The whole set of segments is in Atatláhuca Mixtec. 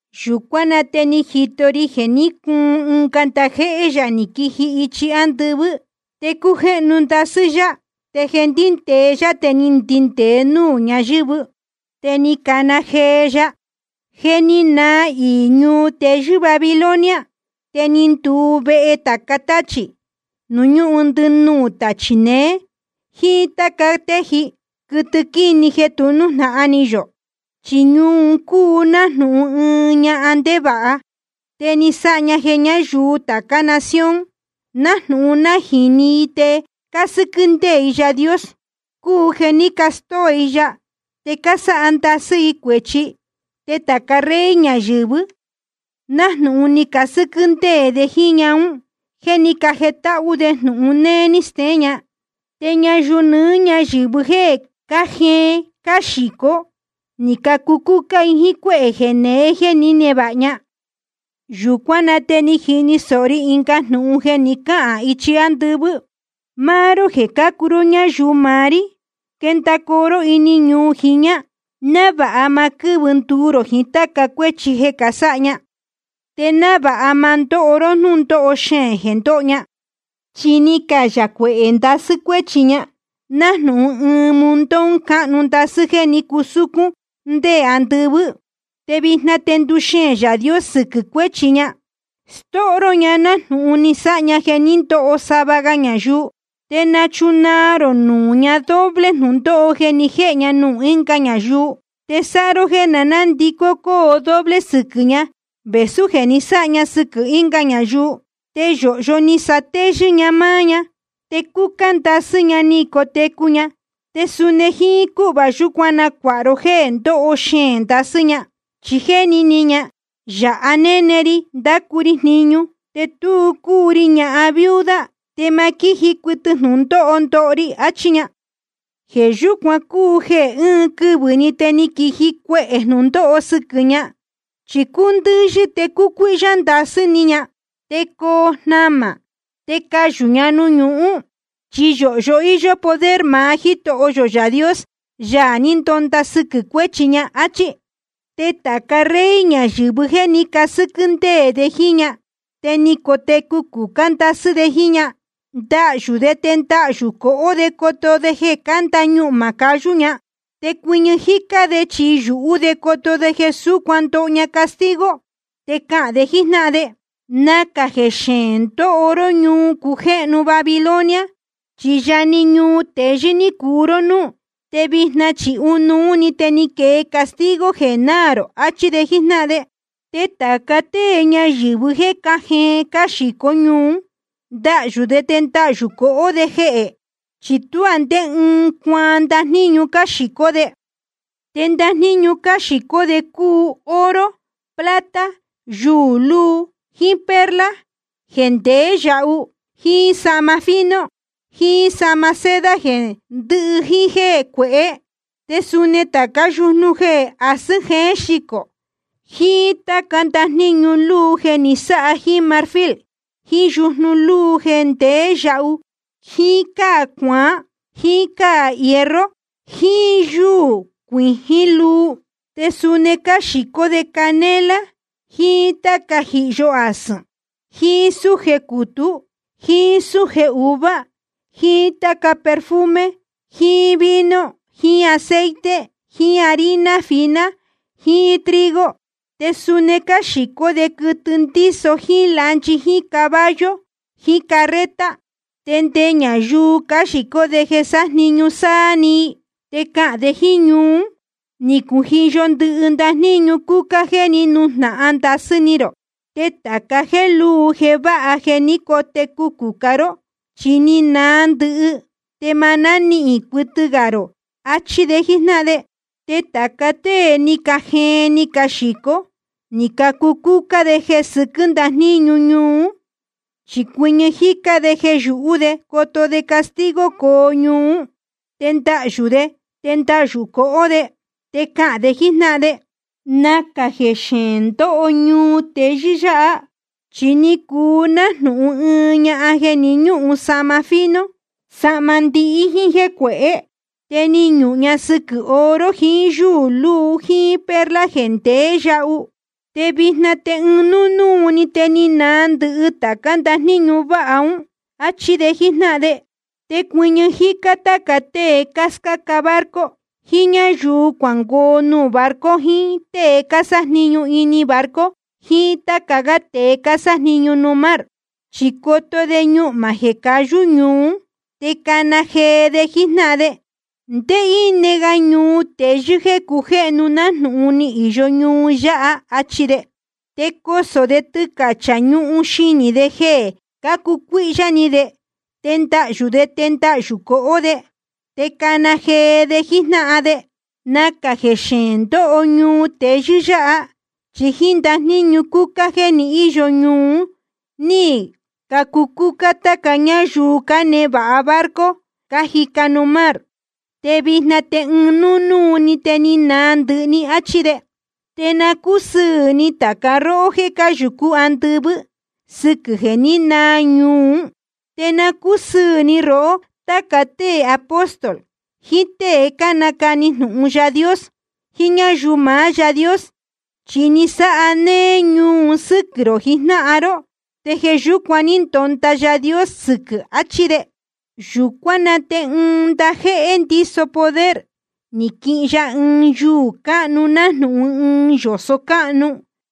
Yūcuán na te ni jito ri jeē ní cuun ɨnga ndajéhé yā ni quiji ichi ándɨvɨ́. Te cújéhnu ndasɨ́ yá. Te jeē ndíndēe yá te ni ndindēe núū ñayɨ̄vɨ́. Te ni cana jee ya: Je ni naa iī ñuu teyɨ́ Babilonia. Te ni nduu vehe tāca táchī, nuū ñúhun ndɨnuū tachī neé, jíín táca téji, quɨtɨ quíni jeē tu nújnahan ni yō. Chi ñuu un cúu nájnūhun ɨɨn ñahan ndevāha, te ni sáha ña jeē ñáyuu tācá nación, nájnūhun nájīni i te cásɨ́quɨ́ ndéē i Yaā Dios, cúu jeē ní castóo i ya te cásáha ndasɨ́ i cuēchi. Te tāca rey ñayɨ̄vɨ, nájnūhun ni casɨ́quɨ́ ndéē de jíín ñahan ún jeē ní cajetáhú de jnūhun néé ní steén ña. Te ñayuu nɨɨ́ ñáyɨ̄vɨ jéē cájeen cáxīcó, ní cacucúcá i jíín cuéhē jeneé jeē ní nevāha ña. Yūcuán na te ni jini sōho ri ɨnga jnūhun jeē ni cáhān ichi ándɨvɨ́: Máá ró jeē cácuu ró ñáyuu maá rí, quendacoo ró ini ñuu jiñā, návāha ma quɨ́vɨ nduu rō jiín táca cuéchi jeē sáha ña, te návāha ma ndóho ró jnúndóho xeēn jeē ndoho ña. Chi ni cayā cuehē ndasɨ́ cuéchi ña, nájnūhun ɨɨn montón cáhnu ndasɨ́ jéē ní cusúcún ndé andɨvɨ́. Te vijna te nduxeēn Yaā Dios sɨquɨ̄ cuéchi ña. Stóho ró ña nájnūhun ni sáha ña jeē ní ndoho sava ga ñayuu. Te nachunaa rō nuū ña doble jnūndóho jeē ni jéhe ña nuū ɨnga ñayuu. Te sáha ró jeē nandicó cóo doble sɨquɨ̄ ña vēsú jeē ni sáha ña sɨquɨ̄ ɨnga ñayuu. Te yōhyo ni satéyɨ́ ña máá ña, te cúcá ndasɨ́ ní cotecu ña. Te suni jíín cúhva yúcuan nacuāha ró jéē ndóho xeēn ndasɨ́ ña. Chi jéni ni ña: Yāha néne ri ndácu ri jniñu, te tu cúu ri ñahan viuda, te ma quíji cuɨtɨ jnūndóho ndoho ri, achí ña. Jeē yúcuan cúu jeē ɨɨn quɨvɨ̄‑ni te quiji cuehē jnūndóho sɨquɨ̄ ña. Chi cuu ndɨ̄yɨ, te cucuíhyá ndasɨ́ ni ña, te coo jnamā, te cayū ña nuū ñuhún. Chi yōhyo íyó poder maá Jítoho yō Yaā Dios, Yaā ní ndonda sɨquɨ̄ cuéchi ña, áchí. Te tāca rey ñayɨ̄vɨ jéē ní casɨ́quɨ́ ndéē de jíín ña te ni cotecu cucá ndasɨ́ de jíín ña, ndahyū de te ndahyū cohó de coto de jeē cánda ñuhmā cayú ña. Te cuɨñɨ jícá de chi yūhú de coto de jeē súcuan ndoho ña castigo. Te cahān de jíjnáhan de: Nacā jeē xeēn ndóho ró, ñuu cujéhnu Babilonia, chi yá‑ni ñuu teyɨ́ ní cuu ró núú. Te vijna chi ɨɨn núnúu‑ni te ni quee castigo jeē náā rō, achi de jíjnáhan de. Te tāca tée ñayɨ̄vɨ jéē cájeen cáxīcó ñuu ún, ndahyū de te ndahyū cohó de jehē. Chi tuá ndé ɨɨn cuaan ndajníñu cáxīcó de. Te ndajníñu cáxīcó de un cúu oro, plata, yuū luu jíín perla jeē ndeé yahu, jíín sahma fino jiín sahma seda jeē ndihí jíín jéē cuehé. Te suni tācá yujnu jeē asɨ̄n jéen xicō, jiín táca ndajníñu luu jeē ni sáha jíín marfil jiín yujnu lúu jeē ndeé yahu jíín cáa cuaán jíín cáa hierro jiín yúū cuijín luu. Te suni cáxīcó de canela jiín táca jíhyo asɨ̄n jiín súje cutú jiín súje uvuā jiín táca perfume jiín vino jiín aceite jiín harina fina jiín trigo. Te suni cáxīcó de quɨtɨ ndíso jíín lanchi jíín caballo jiín carreta, te nde ñayuu cáxīcó de jeē sájniñu sáá‑ni i. Te cahān de jíín ñuu ún: Ni cujiyo ndɨhɨ ndajníñu cúcá jeē ní nujnahan ndasɨ́ ni rō. Te tāca jéē lúu jeē váha jeē ní cotecu cucá ró, chi ni naa ndɨhɨ, te ma nánihīn cuɨtɨ gā rō, achi de jíjnáhan de. Te tāca tée ni cajeen ni caxīco ní cacucúcá jéē sɨquɨ́ ndajníñu ñuu ún, chi cuɨñɨ jícá de jeē yūhú de coto de castigo coo ñuu ún. Te ndahyū de te ndahyū cohó de. Te cahān de jíjnáhan de: Nacā jeē xeēn ndóho ñuu teyɨ́ yáha. Chi ni cuu nájnūhun ɨɨn ñahan jeē ni ñúhun sahma fino, sahma ndihí jíín jéē cuehé. Te ni ñuhun ña sɨquɨ̄ oro jiín yúū luu jíín perla jeē ndeé yahu. Te vijna te ɨɨn núnúu‑ni te ni naa ndɨhɨ tācá ndajníñu váha ún, achi de jíjnáhan de. Te cuɨñɨ jícá táca tée cáscáca barco, jiín ñáyuu cuángoo nuū barco, jiín tée cásájniñu ini barco, jiín táca gá tēe cásájniñu nuū mar. Chi coto de ñuhmā jeē cayú ñuu ún, te cana jee de jíjnáhan de: ¿Ndé íne ga ñuu teyɨ́ jéē cujéhnu nájnūhun ni īyo ñuu yáha? achi de. Te cosō de tɨcachā ñuhun xinī de jeē cácucuíhyá ni de. Te ndahyū de te ndahyū cohó de. Te cana jee de jíjnáhan de: Nacā jeē xeēn ndóho ñuu teyɨ́ yáha. Chi jíín ndajníñu cúcá jeē ni íyo ñuu un ní cacucúcá táca ñáyuu cánevāha barco cájica nuū mar. Te vijna te ɨɨn núnúu‑ni te ni naa ndɨhɨ‑ni, achi de. Te na cúsɨɨ̄ ni tāca róhó jéē cáyūcú andɨvɨ́, sɨquɨ̄ jeē ní naa ñuu ún. Te na cúsɨɨ̄ ni rohó, táca tée apóstol, jiín tée cánacani jnūhun Yaā Dios, jiín ñáyuu maá Yaā Dios. Chi ni sáha néé ñuu un sɨ́quɨ̄ rō jijnáhan ró, te jeē yúcuan ní ndonda Yaā Dios sɨquɨ̄, achi de. Yūcuán na te ɨɨn ndajéhé ndíso poder, ni quihin ya ɨɨn yuū cáhnu nájnūhun ɨɨn yōso cáhnu,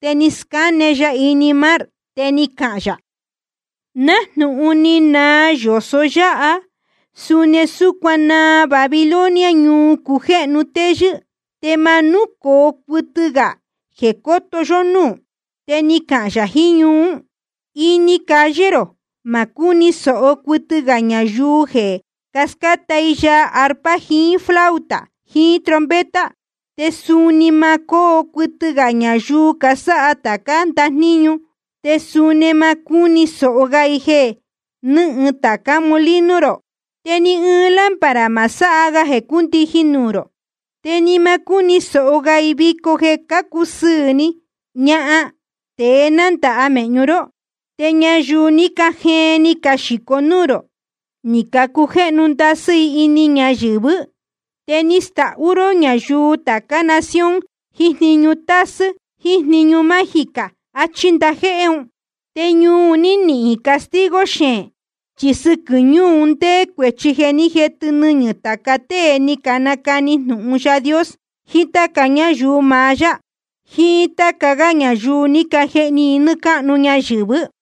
te ni scáne ya ini mar. Te ni cahān yā: Nájnūhun ni naa yōso yáha, suni súcuan naa Babilonia, ñuu cujéhnu téyɨ́. Te ma núcoo cuɨtɨ gā jeē cóto yó núū. Te ni cahān yā jiín ñuu ún: Ini calle rō ma cúni sōho cuɨtɨ gā ñayuu jeē scáta i yaa arpa jiín flauta jiín trompeta. Te suni ma cóo cuɨtɨ gā ñayuu casáha tācá ndajníñu. Te suni ma cúni sōho ga i jeē nɨ́hɨn tācá molino rō. Te ni ɨɨn lámpara ma sáha ga jeē cúndijin nuū rō. Te ni ma cúni sōho ga i vico jeē cácusɨɨ̄ ni ñahan tēe nándāha mēhñu ró. Te ñayuu ní cajeen ni caxīcó nuū rō, ni cacujéhnu ndasɨ́ i ini ñayɨ̄vɨ́. Te ni stahú ró ñayuu tācá nación jiín jniñu tasɨ́ jíín jniñu mágica. Achí ndajéhé un. Te ñuu un ní nihīn castigo xeēn, chi sɨquɨ̄ ñuu un ndéé cuēchi jeē ní jetɨ nɨñɨ̄ tāca tée ní canacani jnūhun Yaā Dios, jiín táca ñáyuu maá yá, jiín táca gá ñayuu ní cajehni i nɨ́ɨ́ cáhnu ñayɨ̄vɨ́.